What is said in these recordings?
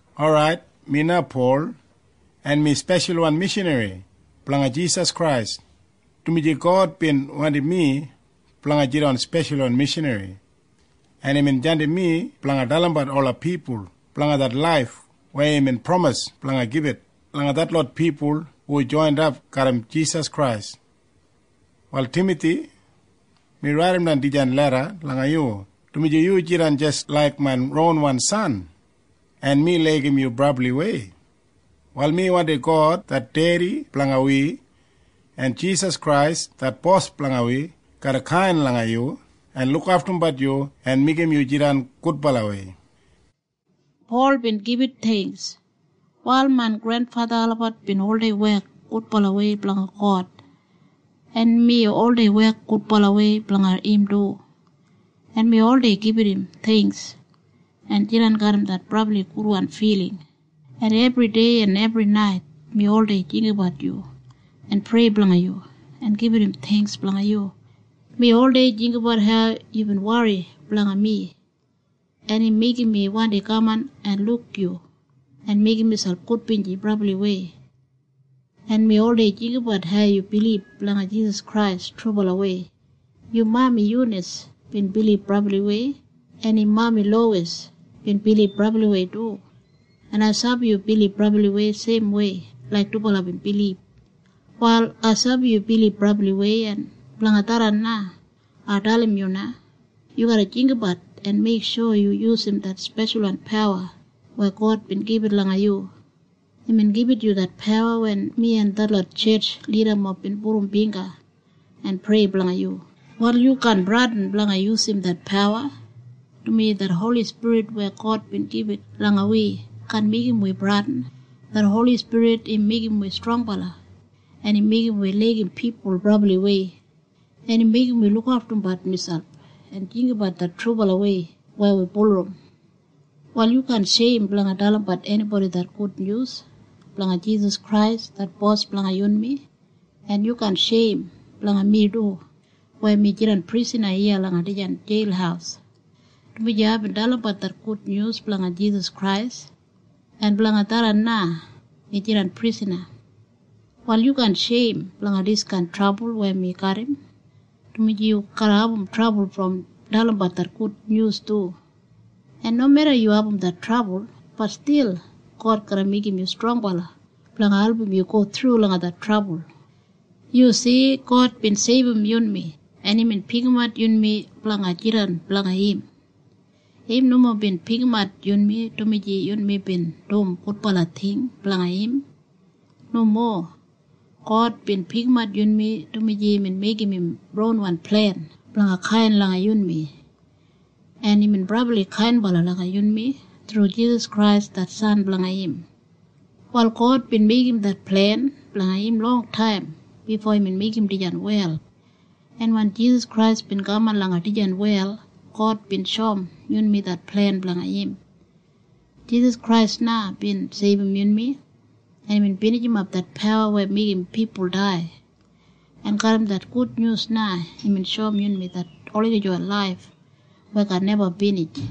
Orait, mi na Pol, en mi speshalwan mishanri blanga Jisas Krais, dumaji God bin wandim mi blanga jidan speshalwan mishanri, en imbin jandim mi blanga dalimbat ola pipul blanga det laif weya imbin pramis blanga gibit langa detlot pipul hu joinap garram Jisas Krais. Wal Timathi, mi raidimbat dijan leda langa yu, dumaji yu jidan jis laik main ronwan san, en mi laigim yu brabliwei. Wal mi wandim God det Dedi blanga wi en Jisas Krais det Bos blanga wi garra kain langa yu en lukaftumbat yu en meigim yu jidan gudbalawei. Prayer Wal main grenfatha olabat bin oldei wek gudbalawei blanga God, en mi oldei wek gudbalawei blanga im du, en mi oldei gibit im theingks en jidan garram det brabli gudwan filing, en ebridei en ebrinait mi oldei jinggabat yu en prei blanga yu en gibit im theingks blanga yu. Mi oldei jinggabat hau yubin wori blanga mi, en im meigim mi wandi kaman en luk yu en meigim miselp gudbinji brabliwei. En mi oldei jinggabat hau yu bilib langa Jisas Krais trubalawei. Yu mami Yunas bin bilib brabliwei, en im mami Lowis bin bilib brabliwei du, en ai sabi yu bilib brabliwei seimwei laik dubala bin bilib. Wal ai sabi yu bilib brabliwei, en blanga tharran na ai dalim yu na. Yu garra jinggabat en meiksho yu yusum det speshalwan pawa weya God bin gibit langa yu. Imbin gibit yu det pawa wen mi en detlot tjetj lidamob bin pudum bingga en prei blanga yu. Wal yu kaan bradin blanga yusum det pawa, dumaji det Holi Spirit weya God bin gibit langa wi kaan meigim wi bradin. Det Holi Spirit im meigim wi strongbala, en im meigim wi laigim pipul brabliwei, en im meigim wi lukaftumbat miselp en jinggabat det trubalawei weya wi bulurrum. Wal yu kaan sheim blanga dalimbat enibodi det gudnyus blanga Jisas Krais det Bos blanga yunmi, en yu kaan sheim blanga mi du weya mi jidan prisana iya langa dijan jeil, dumaji aibin dalimbat det gudnyus blanga Jisas Krais, en blanga tharran na mi jidan prisana. Wal yu kaan sheim blanga diskain trabul weya mi garram, dumaji yu garra abum trabul brom dalimbat det gudnyus du. En nomeda yu abum det trabul, bat stil God garra meigim yu strongbala blanga album yu go thru langa det trabul. Yu si? God bin seibum yunmi, en imbin pikimat yunmi blanga jidan blanga im. Im nomo bin pikimat yunmi dumaji yunmi bin dum gudbala ting blanga im. Nomo. God bin pikimat yunmi dumaji imbin meigim im ronwan plen blanga kain langa yunmi. En imbin brabli kainbala langa yunmi thru Jisas Krais det San blanga im. Wal God bin meigim det plen blanga im longtaim bifo imbin meigim dijan wel. En wen Jisas Krais bin kaman langa dijan wel, God bin shoum yunmi det plen blanga im. Jisas Krais na bin seibum yunmi, en imbin binijimap det pawa weya meigim pipul dai, en garram det gudnyus na imbin shoum yunmi det olagijawan laif weya kaan neba binij.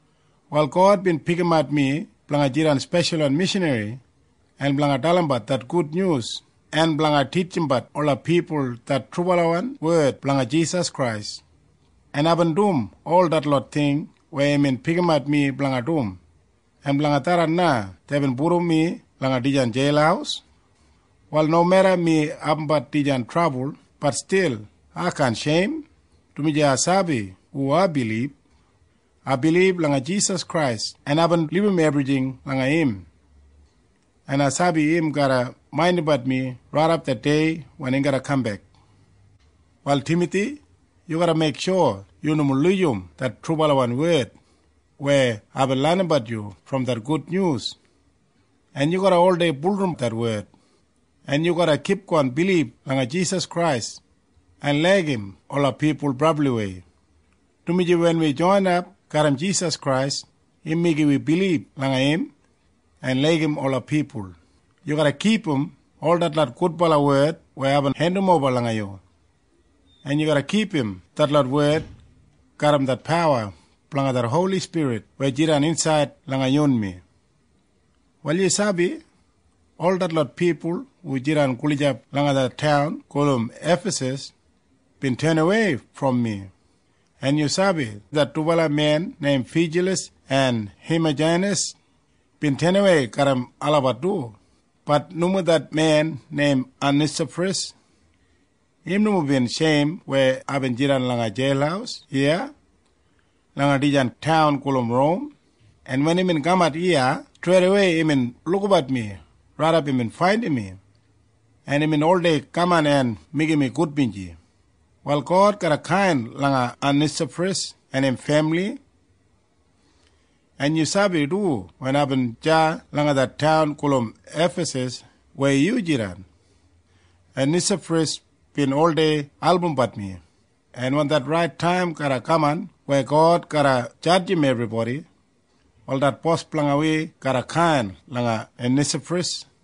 Wal God bin pikimat mi blanga jidan speshalwan mishanri en blanga dalimbat det gudnyus en blanga titjimbat ola pipul det trubalawan wed blanga Jisas Krais, en aibin dum ol detlot ting weya imbin pikimat mi blanga dum, en blanga tharran na deibin pudum mi langa dijan jeil. Wal nomeda mi abumbat dijan trabul, bat stil ai kaan sheim, dumaji ai sabi hu ai bilib. Ai bilib langa Jisas Krais, en aibin libum ebrijing langa im, en ai sabi im garra maindimbat mi raidap det dei wen im garra kambek. Wal Timathi, yu garra meiksho yu nomo lujim det trubalawan wed weya aibin lenimbat yu brom det gudnyus, en yu garra oldei bulurrum det wed, en yu garra kipgon bilib langa Jisas Krais en laigim ola pipul brabliwei, dumaji wen wi joinap garram Jisas Krais, im meigim wi bilib langa im en laigim ola pipul. Yu garra kipum ol detlot gudbala wed weya aibin hendimoba langa yu, en yu garra kipum detlot wed garram det pawa blanga det Holi Spirit weya jidan insaid langa yunmi. Wal yu sabi ol detlot pipul hu jidan gulijap langa det taun gulum Efasas bin tenawei brom mi, en yu sabi det dubala men neim Fijalas en Hemajanis bin tenawei garram olabat du. Bat nomo det men neim Onesafras. Im nomo bin sheim weya aibin jidan langa jeil iya langa dijan taun gulum Rom, en wen imbin kamat iya, streidawei imbin lukabat mi raidap imbin faindim mi, en imbin oldei kaman en meigim mi gudbinji. Wal God garra kain langa Onesafras en im femili. En yu sabi du wen aibin deya langa det taun gulum Efasas weya yu jidan, Onesafras bin oldei albumbat mi. En wen det rait taim garra kaman weya God garra jadjim ebribodi, wal det Bos blanga wi garra kain langa Onesafras.